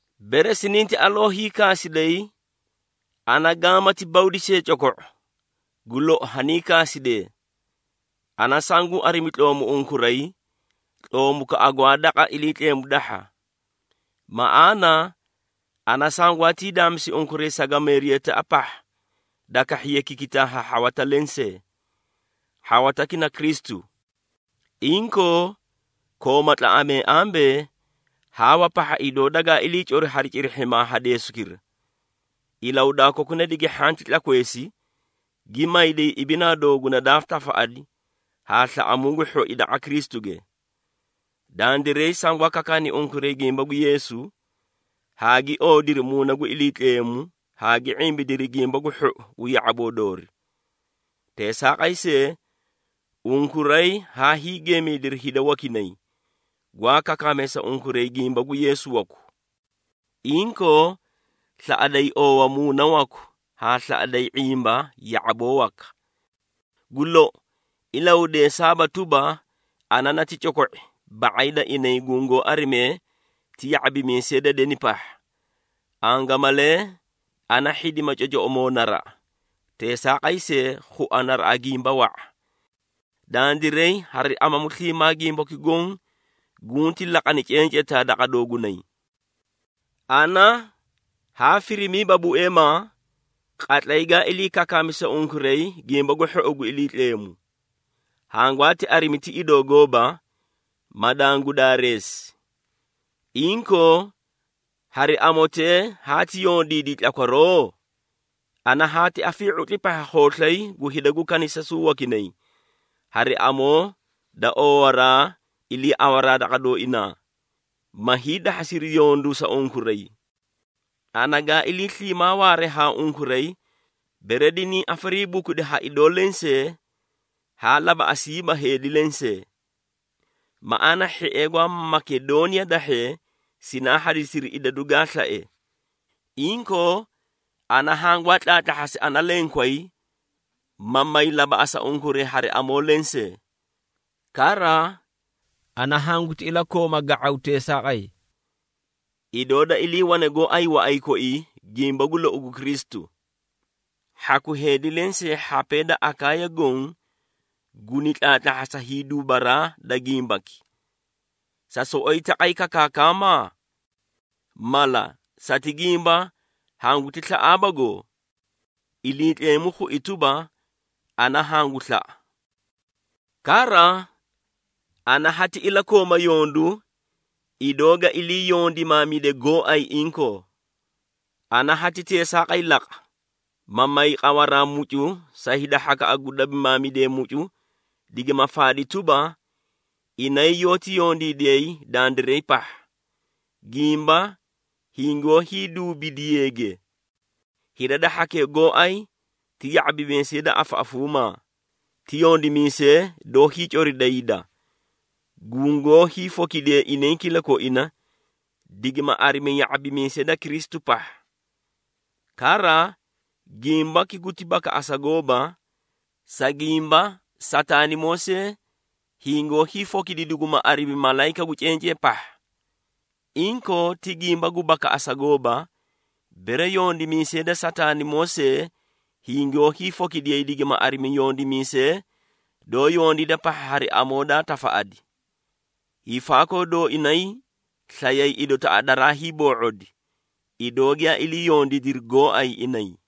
Bere sininti aloo hiikaasiday, ana gaamati bawdi see coko⁄o! Gu lou, haniikaasidee! Ana sanguu arimi tloomu unkuray, tloomukaꞌa gwaa daqa Iliitleemu dahha. Maꞌaana, ana sangwaatii daamisi unkuray sagameeriyataꞌa pahha da kahhiye kikitaa ha hhawata lensee. Hhawataki na Kristu. Inkoo, kooma tlaꞌamee ambee, Haawa pahha idoo dagaa iliicori hari cirihhimaa ha deesukira, ilahudaa kokuna digi hhanti tlakweesi, gi mayday ibinaa dooguna daa tafaꞌadi haa slaꞌamuu gu hhoi daqa Kristuge. Dandiray sangwaa kakaani unkuray gimba gu Yeesu, haa gi oodiri Muuna gu Iliitleemu haa gi ⁄imbidiri Gimba gu Hhou gu ya⁄aboo doori. Teesaaqay see, unkuray haa hiigeemaydiri hida wakinay, gwaa kakaamee sa unkuray gimba gu Yeesu waku. Inkoo, slaꞌaday oowa muuna waku haa slaꞌaday ⁄imba ya⁄aboo waka. Gu lou, ilahudeesaaba tuba, ana nati coko⁄i ba⁄ay da inay gungoó arimee ti ya⁄abimiisee da deni pahha. Angamalee ana hhidima cocoꞌomoo naraꞌa, teesaaqay see, khua naraꞌa gimba wa⁄a. Dandiray hari amamu sliimaa gimbaki goõ gunti laqani cencetaa daqa doogunay. Ana haa firimiiba bueemaa, qatlay gaa ilii kakaami sa unkuray Gimba gu Hhou gu Iliitleemu. Hangwaati arimi ti idoo gooba, ma dangu daareesi. Inkoo, hari amotee haati yondiidi tlakwaroo? Ana haati afii⁄utli pahha khooslay gu hida gu kanisasuu wakinay hari amoo da oowaraa iliiawaraa daqa dooinaa, ma hiidahhasi yondu sa unkuray. Ana gaa ilii sliimaa waare haa unkuray bere diniĩ afariibukudi ha idoo lensee haa labaꞌasiiba heedi lensee. Maꞌaana hhiee gwaa Makedooniya dahhee sinaa hadisiri idadu gaa slae. Inkoo, ana hangwaa tlaatlahhasi ana lenkway, ma may labaꞌasa unkuray hari amoo lensee. Kara, ana hanguti ilakooma ga⁄aw teesaaqay. Idoo da iliiwane gooay waꞌay koii gimba gu lou gu Kristu, hhaku heedi lensee hhapee da Akaaya goõ, guni tlaatlahhasa hiiduubaraa da gimbaki. Sa soꞌoyi taqay kakaakama? Mala, sati gimba hangu slaꞌaabago? Iliitleemu khui tuba, ana hangu slaꞌa! Kara, ana hati ilakooma yondu, idoo ga ilii yondimaamide gooay inkoo. Ana hati teesaaqay laqa, ma may qawaraa mucu sa hhakaꞌa gu dabimaamidee mucu digima faadi tuba, inay yoóti yondiidiyay dandiray pahha, gimba hingoó hiiduubidiyeege. Hida da hhakee gooay ti ya⁄abimiisee da afaꞌafuumaa, ti yondimiisee doó hiicorida hida, gungoó hiifokidee inay kilakoina digima arimi ya⁄abimiisee da Kristu pahha. Kara, gimbaki guti bakaꞌasa gooba, sa gimba Sataanimoo see, hingoó hiifokidi duguma arimi, malayika gu cencee pahha. Inkoo, ti gimba gu bakaꞌasa gooba, bere yondimiisee da Sataanimoo see hingoó hiifokidiyay digima arimi yondimiisee doó yondiida pahha hari amoo daa tafaꞌadi. Hiifaakoo dooinay slayay idotaꞌa daraa hiiboo⁄odi, idoo giyaa ilii yondiidiri gooay inay.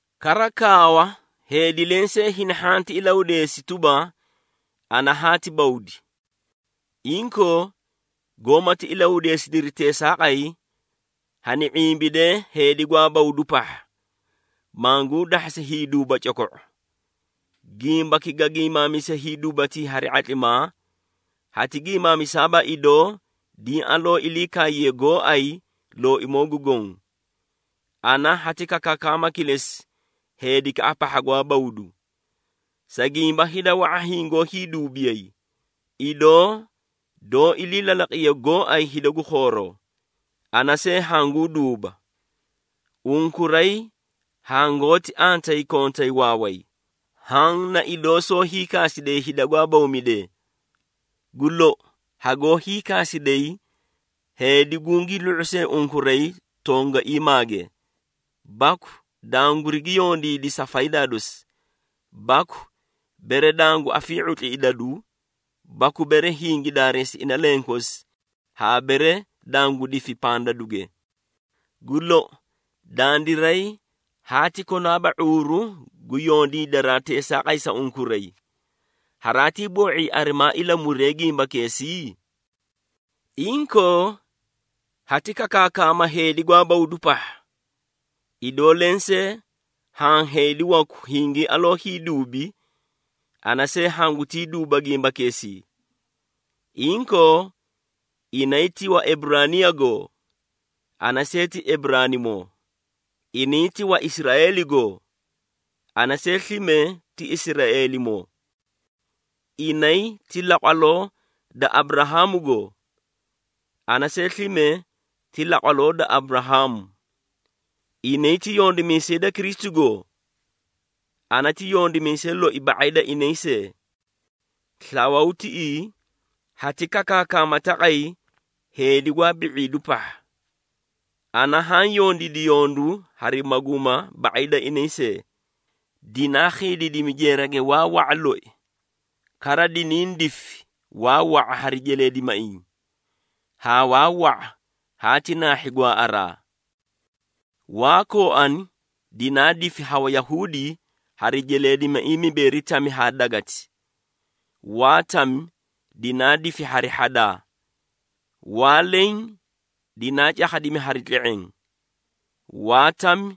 Kara kaawa, heedi lensee hini hhanti ilahudeesi tuba, ana haati bawdi. Inkoo, goómati ilahudeesidiri teesaaqay, hani ⁄imbidee heedi gwaa bawdu pahha, manguu dahhasi hiiduuba coko⁄o. Gimbaki ga giimaamise hiiduubatii hari ⁄atlimaa, hati giimaamisaaba idoo diĩ aloo ilii kaaye gooay Looimoo gu Goõ. Ana hati kakaakama kilesi heedikaꞌa pahha gwaa bawdu. Sa gimba hida wa⁄a hingoótii duubidiyay, idoo doó ilii lalaqiye gooay hida gu khooroo, ana see hanguu duuba. Unkuray hangoóti antayi kontay waaway, haã na idoo soó hiikaasidee hida gwaa bawmidee! Gu lou, hagoó hiikaasiday heedi gungii lu⁄u see unkuray tongaiimaage, baku dangurigi yondiidi sa faydaa dosi, baku bere dangu afii⁄utli idadu, baku bere hingi daareesi ina lenkosi haa bere dangu difi pandaduge. Gu lou, dandiray haati konaaba ⁄uuru gu yondiidaraa teesaaqay sa unkuray. Haraatii boo⁄ii arimaa ilamuree gimbakeesii? Inkoo, hati kakaakama heedi gwaa bawdu pahha. Idoo lensee haã heedi waku hingii aloo hiiduubi, ana see hangutii duuba gimbakeesii. Inkoo, inay ti Waeburaaniyagoo? Ana see ti Eburaanimoo. Inay ti Waisraeeligoo? Ana see slime ti Israeelimoo. Inay ti laqwaloo da Aburahaamugoo? Ana see slime ti laqwaloo da Aburahaamu. Inay ti yondimiisee da Kristu goo? Ana ti yondimiisay loi ba⁄ay da inay see. Slawuu tiꞌii hati kakaakama taqay heedi gwaa bi⁄iidu pahha. Ana haã yondiidi yondu hari maguuma ba⁄ay da inay see, dinaa khiidiidimi jeerage waa wa⁄a loi. Kara, diniĩ difi waa wa⁄a hari jeleedimaiĩ, haa waa wa⁄a haati naahhi gwaaꞌaraa. Waa kooani dinaa difi ha Wayahuudi hari jeleedimaiĩ mibeeri tami haa dagati. Waa tami dinaa difi hari hhadaa. Waa leẽ dinaa cakhadimi hari tle⁄eẽ. Waa tami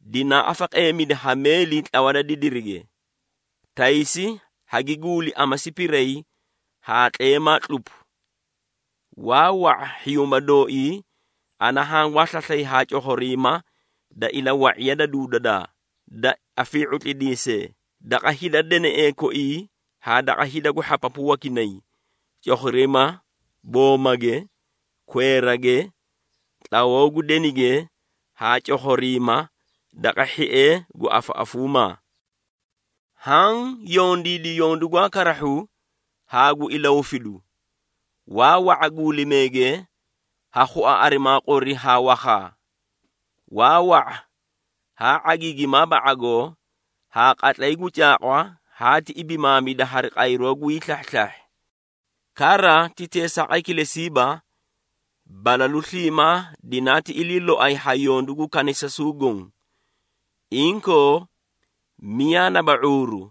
dinaa afaqeemidi ha meeli tlawa da didirige, taysi hagi guuli amasi piray haa tleemaa tlupu. Waa wa⁄a hhiyuuma dooii ana hangwaa slaslay haa cokhoriima da ilawa⁄iya da duududaa, da afii⁄utlidiisee, daqa hida deneꞌee koi haa daqa hida gu hhapapu wakinay, cokhoriima boomamuge, kweerage, tlawoo gu denige haa cokhoriima daqa hhiee gu afaꞌafuumaa. Haã yondiidi yondu gwaa karahhu haa gu ilahufidu. Waa wa⁄a guulimeege ha khua arimaa qori haa wakhaa. Waa wa⁄a haa ⁄agiigimaaba ⁄agoo haa qatlay gu caaqwa haati ibimaamida hari qayroo gwii slahhislahhi. Kara, ti teesaaqay kilesiiba, balalu sliimaa dinaati ilii loay ha yondu gu kanisasuu goõ. Inkoo, miyaa naba ⁄uuru,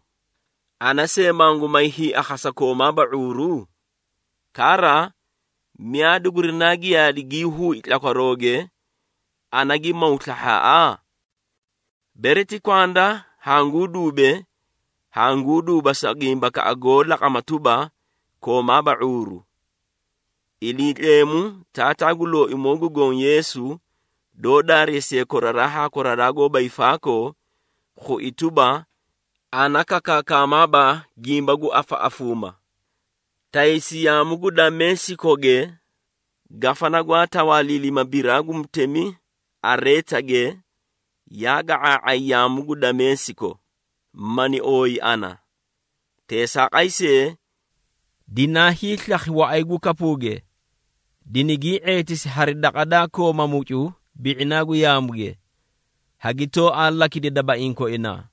ana see mangu may hiiakhasa koomaaba ⁄uuru? Kara, miyaa dugurinaa giyaadi gii huui tlakwarooge, ana gi maw slahhaaꞌa? Bere ti kwanda hanguu duube, hanguu duuba sa gimbakaꞌa goó laqama tuba, koomaaba ⁄uuru. Iliitleemu, Taataa gu Looimoo gu Goõ Yeesu, doó daareesiye koraraa haa koraraa goóba hiifaakoo, khui tuba, ana kakaakamaaba gimba gu afaꞌafuuma. Taysi yaamu gu Dameesikoge, gafana gwaa tawaaliilima biraa gu mutemi Areetage, yaa ga⁄aa⁄ay yaamu gu Dameesiko, mani ooyi ana. Teesaaqay see, dinaa hiislakhi waꞌay gu kapuuge, dinigii ⁄eetisi hari daqa daa kooma mucu bi⁄inaa gu yaamuge, hagi tooaa lakidi dabaiĩ koinaa.